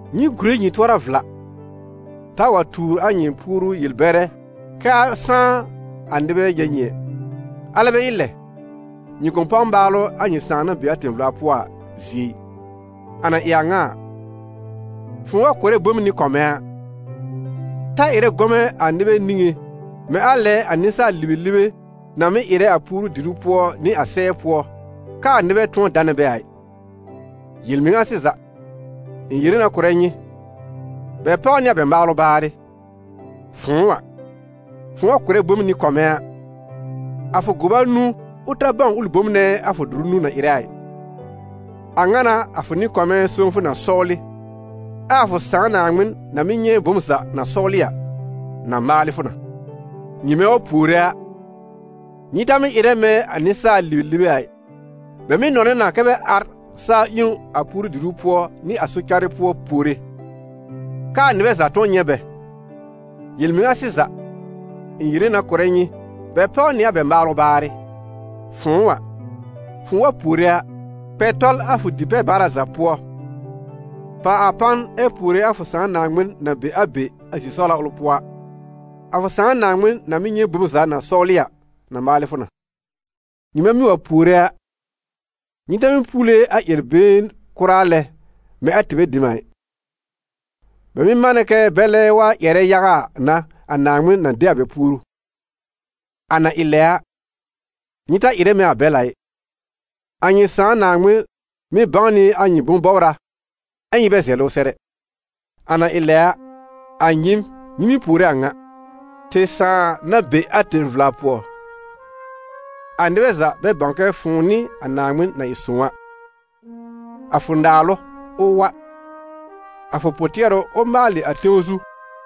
«Nyɩ gùre nyɩ tʋɔra vla, taa wa tuur a nyɩ puoru yel-bɛrɛ kɛ́ a sãá a nɩbɛ nyɛ̃ nyɩ ɛ, alɛ bɛ ɩ lɛ, nyɩ kʋ̃ páw maalʋ a nyɩ Sãà na be a tẽ-vla pʋɔ a zie ɩ. A na ɩ a ŋa a, fʋ̃ʋ wa kʋ̀rɛ bom nɩ-kɔmɛ̃ a, ta ɩrɛ gɔmɛ̃ a nɩbɛ niŋé mɛ̃ a lɛ a nɩsaal-libelibe na mɩ́ ɩrɛ a puoru-diru pʋɔ nɩ a sɛɛ pʋɔ, k'aa nɩbɛ tʋ̃ɔ danɛ bɛ a ɩ; yel-mɩŋa sɩza, ɩ̃ yere na kʋ̀rɛ nyɩ, bɛ páw nɩ a bɛ maalʋ baarɩ. Fʋ̃ʋ a, fʋ̃ʋ wa kʋ̀rɛ bom nɩ-kɔmɛ̃ a, a fʋ gʋba nũu, ʋ ta bãw ʋlɩ bom nɛ a fʋ dʋrʋ nũu na ɩrɛ a ɩ. A ŋa n'a a fʋ nɩ-kɔmɛ̃ sõwfʋ na sɔwlɩ, ɛ a fʋ Sãà Naaŋmɩn na mɩ́ nyɛ̃ bom za na sɔwlɩ a, na maalɩ fʋ na.» «Nyɩmɛ wa puore a, nyɩ ta mɩ́ ɩrɛ mɛ̃ a nɩsaal-libelibe a ɩ: bɛ mɩ́ nɔnɛ na kɛ bɛ ar sa-ƴẽwn a puoru-diru pʋɔ nɩ a sɔ-carɩ pʋɔ puore, k'aa nɩbɛ za tʋ̃ɔ nyɛ̃ bɛ. Yel-mɩŋa sɩza, ɩ̃ yere na kʋ̀rɛ nyɩ, bɛ páw nɩ a bɛ maalʋ baarɩ. Fʋ̃ʋ a, fʋ̃ʋ wa puore a, kpɛ tɔl a fʋ di-pɛ-baara za pʋɔ, pàw a pan ɛ puore a fʋ Sãà Naaŋmɩn na be a be, a zi-sɔwla ʋl pʋɔ a. A fʋ Sãà Naaŋmɩn na mɩ́ nyɛ̃ bom za na sɔwlɩ a, na maalɩ fʋ na. Nyɩmɛ mɩ́ wa puore a, nyɩ ta mɩ́ puule a ƴɛr-been kʋra lɛ mɛ̃ a tɩbɛ dem a ɩ: bɛ mɩ́ manɛ kɛ bɛlɛ wa ƴɛrɛ yaga a n'a a Naaŋmɩn na de a bɛ puoru. A na ɩ lɛ a, nyɩ ta ɩrɛ mɛ̃ a bɛl a ɩ, a nyɩ Sãà Naaŋmɩn mɩ́ bãw nɩ a nyɩ bʋ̃-bɔbra ɛ nyɩ bɛ zɛlɩ ʋ sɛr ɛ. A na ɩ lɛ a, a nyɩɩm, nyɩ mɩ́ puore a ŋa: ‹Tɩ Sãà na be a tẽ-vla pʋɔ, a nɩbɛ za, bɛ bãw kɛ fʋ̃ʋ n'ɩ a Naaŋmɩn na ɩ sõw a, a fʋ naalʋ, ʋ wa, a fʋ pʋ-tɩɛrʋ, ʋ maalɩ a tẽw zu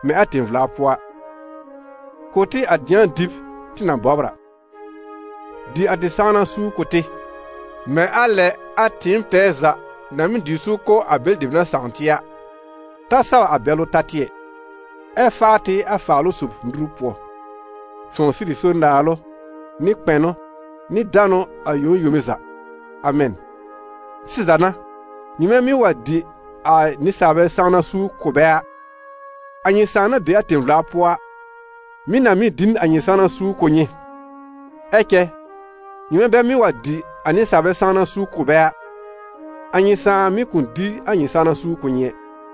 mɛ̃ a tẽ-vla pʋɔ a. Kʋ̀ tɩ a dɩ̃a dɩb tɩ na bɔbr a. Dɩ a tɩ sãwna suur kʋ̀ tɩ, mɛ̃ a lɛ a tɩɩm tɛɛ za na mɩ́ dɩ suur kʋ̀ a bɛlɩ dem na sãw tɩ a. Ta saw a bɛlʋ ta tɩ ɛ, ɛ faa tɩ a Faalʋ-sob nuru pʋɔ. [Fʋ̃ʋ sɩrɩ so naalʋ nɩ kpɛnʋ nɩ danʋ, a yome yome za. Amɛn.]› Sɩza n'a, nyɩmɛ mɩ́ wa dɩ a nɩsaalbɛ sãwna suur kʋ̀ bɛ a, a nyɩ Sãà na be a tẽ-vla pʋɔ a, mɩ̀ na mɩ́ dɩ n a nyɩ sãwna suur kʋ̀ nyɩ. Ɛ cɛ nyɩmɛ bɛ mɩ́ wa dɩ a nɩsaalbɛ sãwna suur kʋ̀ bɛ a, a nyɩ Sãa mɩ̀ kʋ̃ dɩ a nyɩ sãwna suur kʋ̀ nyɩ ɛ.»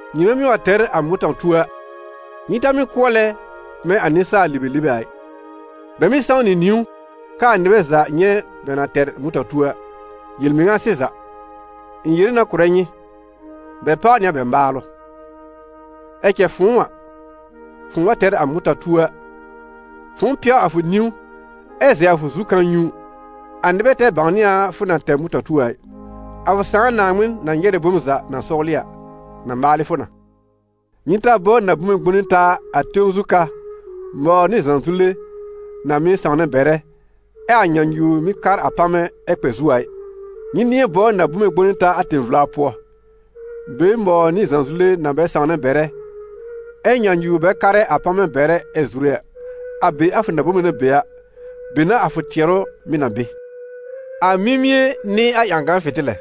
«Nyɩmɛ mɩ́ wa tɛr a mʋta-tuo a, nyɩ ta mɩ́ kʋɔlɛ mɛ̃ a nɩsaal-libelibe a ɩ, bɛ mɩ́ sãw nɩ niwn k'aa nɩbɛ za nyɛ̃ bɛ na tɛr a mʋ̃ta-tuo a. Yel-mɩŋa sɩza, ɩ̃ yere na kʋ̀rɛ nyɩ, bɛ páw nɩ a bɛ maalʋ. Ɛ cɛ fʋ̃ʋ a, fʋ̃ʋ wa tɛr a mʋta-tuo a, fʋ̃ʋ pɛw a fʋ niwn ɛ zɛ a fʋ zu kãa-nyũu, a nɩbɛ ta bãwnɩ a fʋ na tɛr mʋta-tuo a ɩ, a fʋ Sãà Naaŋmɩn na nyɛrɛ bom za na sɔwlɩ a, na maalɩ fʋ na.» «Nyɩ ta bɔbr na-bome gbõne taa a tẽw zu ka, mɔwr nɩ zãzule na mɩ́ sãwnɛ bɛrɛ, ɛ a nyãnyuwr mɩ́ kar a pamɛ ɛ kpɛ zu a ɩ. Nyɩ nɩ̃ɛ bɔbr na-bome gbõne taa a tẽ-vla pʋɔ, be mɔwr nɩ zãzule na bɛ sãwnɛ bɛrɛ a, ɛ nyãnyuwr bɛ karɛ a pamɛ bɛrɛ ɛ zure a. A be a fʋ na-bome na be a, be n'a a fʋ tɩɛrʋ mɩ̀ na be.» «A mimie n'ɩ a ƴãgan fɩ̃tɩlɛ.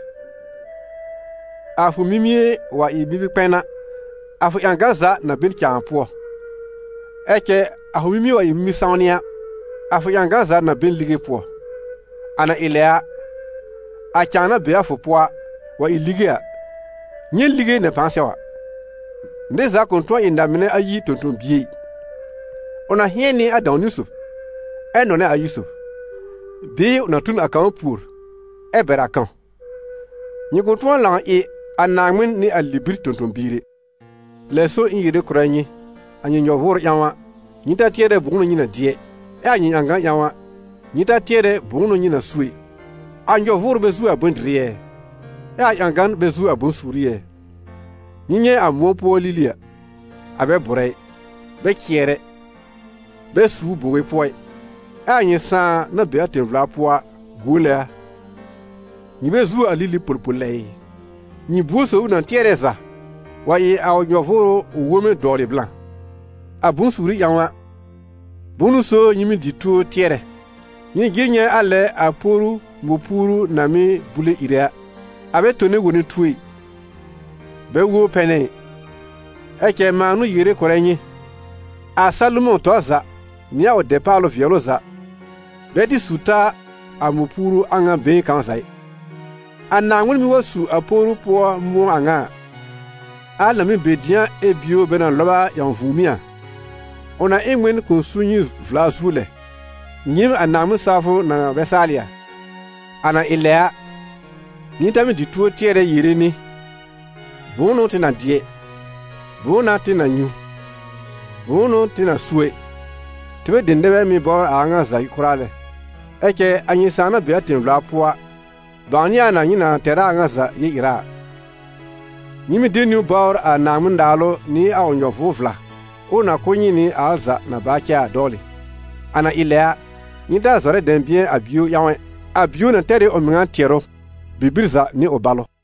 A fʋ mimie wa ɩ mimi-kpɛn a, a fʋ ƴãgan za na be n cãa pʋɔ; ɛ cɛ a fʋ mimie wa ɩ mimi-sãwnɩ a, a fʋ ƴãgan za na be n lige pʋɔ. A na ɩ lɛ a, a cãa na be a fʋ pʋɔ a, wa ɩ lige a, nyɛ̃ lige na pãa sɛw a!» «Nɩr za kʋ̃ tʋ̃ɔ ɩ na-mɩnɛ ayi tõ-tõ-bie ɩ: ʋ na hɩ̃ɛn nɩ a dãw-niwn sob, ɛ nɔnɛ a ayi sob; bɩɩ ʋ na tu n a kãw pùor, ɛ bɛr a kãw. Nyɩ kʋ̃ tʋ̃ɔ lãw ɩ a Naaŋmɩn nɩ a libir tõ-tõ-biir ɛ.» «Lɛ so, ɩ̃ yere kʋ̀rɛ nyɩ: a nyɩ nyɔ-vʋʋrʋ ƴãw a, nyɩ ta tɩɛrɛ bʋ̃ʋ n'ʋ nyɩ na dɩ ɛ; ɛ a nyɩ ƴãgan ƴãw a, nyɩ ta tɩɛrɛ bʋ̃ʋ n'ʋ nyɩ na su ɛ. A nyɔ-vʋʋrʋ bɛ zuo a bʋ̃-dɩrɩ ɛ? Ɛ a ƴãgan bɛ zuo a bʋ̃-suuri ɛ? Nyɩ nyɛ̃ a mʋ̃ɔ pʋɔ lili a, a bɛ bʋ̀rɛ ɩ, bɛ cɩɛr ɛ, bɛ suur bowe pʋɔ ɩ, ɛ a nyɩ Sãà na be a tẽ-vla pʋɔ a, guole a; nyɩ bɛ zuo a lili polpol lɛ ɩ? Nyɩ buor sob ʋ na tɩɛrɛ za, wa ɩ a ʋ nyɔ-vʋʋrʋ ʋ wõwme dɔwlɩ blã? A bʋ̃-suuri ƴãw a, bʋ̃ʋ n'ʋ so nyɩ mɩ́ dɩ tuo tɩɛrɛ? Nyɩ jɩr nyɛ̃ a lɛ a poru mɔ̃-puuru na mɩ́ bule ìre a: a bɛ tone wone tuo ɛ, bɛ wobr pɛnɛ ɩ, ɛ cɛ mãa n'ʋ yere kʋ̀rɛ nyɩ, a Salomɔ̃ tɔr za, nɩ a ʋ dɛpaalʋ vɩɛlʋ za, bɛ tɩ su ta a mɔ̃-puuru a ŋa been kãw za ɩ. A Naaŋmɩn mɩ́ wa su a poru pʋɔ mʋ̃ɔ a ŋa a, al na mɩ́ be dɩ̃a ɛ bio bɛ na lɔb a ƴãw vũùmí a, ʋ na ɩ n ŋmɩn kʋ̃ su nyɩ vla zuo lɛ, nyɩɩm a Naaŋmɩn-sawfʋ na bɛ saalɩ a! A na ɩ lɛ a, nyɩ ta mɩ́ dɩ tuo tɩɛrɛ yere nɩ: bʋ̃ʋ n'ʋ tɩ na dɩ? Bʋ̃ʋ n'a tɩ na nyũ? Bʋ̃ʋ n'ʋ tɩ na su ɛ? Tɩbɛ dem nɛ bɛ mɩ́ bɔbr a a ŋa za kʋra lɛ. Ɛ cɛ a nyɩ Sãà na be a tẽ-vla pʋɔ a, bãwnɩ a na nyɩ na tɛr a a ŋa za yel-ɩra a. Nyɩ mɩ́ de niwn bɔbr a Naaŋmɩn-Naalʋ nɩ a ʋ nyɔ-vʋʋr-vla, ʋʋ na kʋ̀ nyɩ nɩ a al za na baa cɛ a dɔwlɩ. A na ɩ lɛ a, nyɩ ta zɔrɛ dɛ̃bɩ̃ɛ a bio ƴãw ɛ, a bio na tɛr ɩ a ʋ mɩŋa tɩɛrʋ. Bibir za nɩ ʋ balʋ.»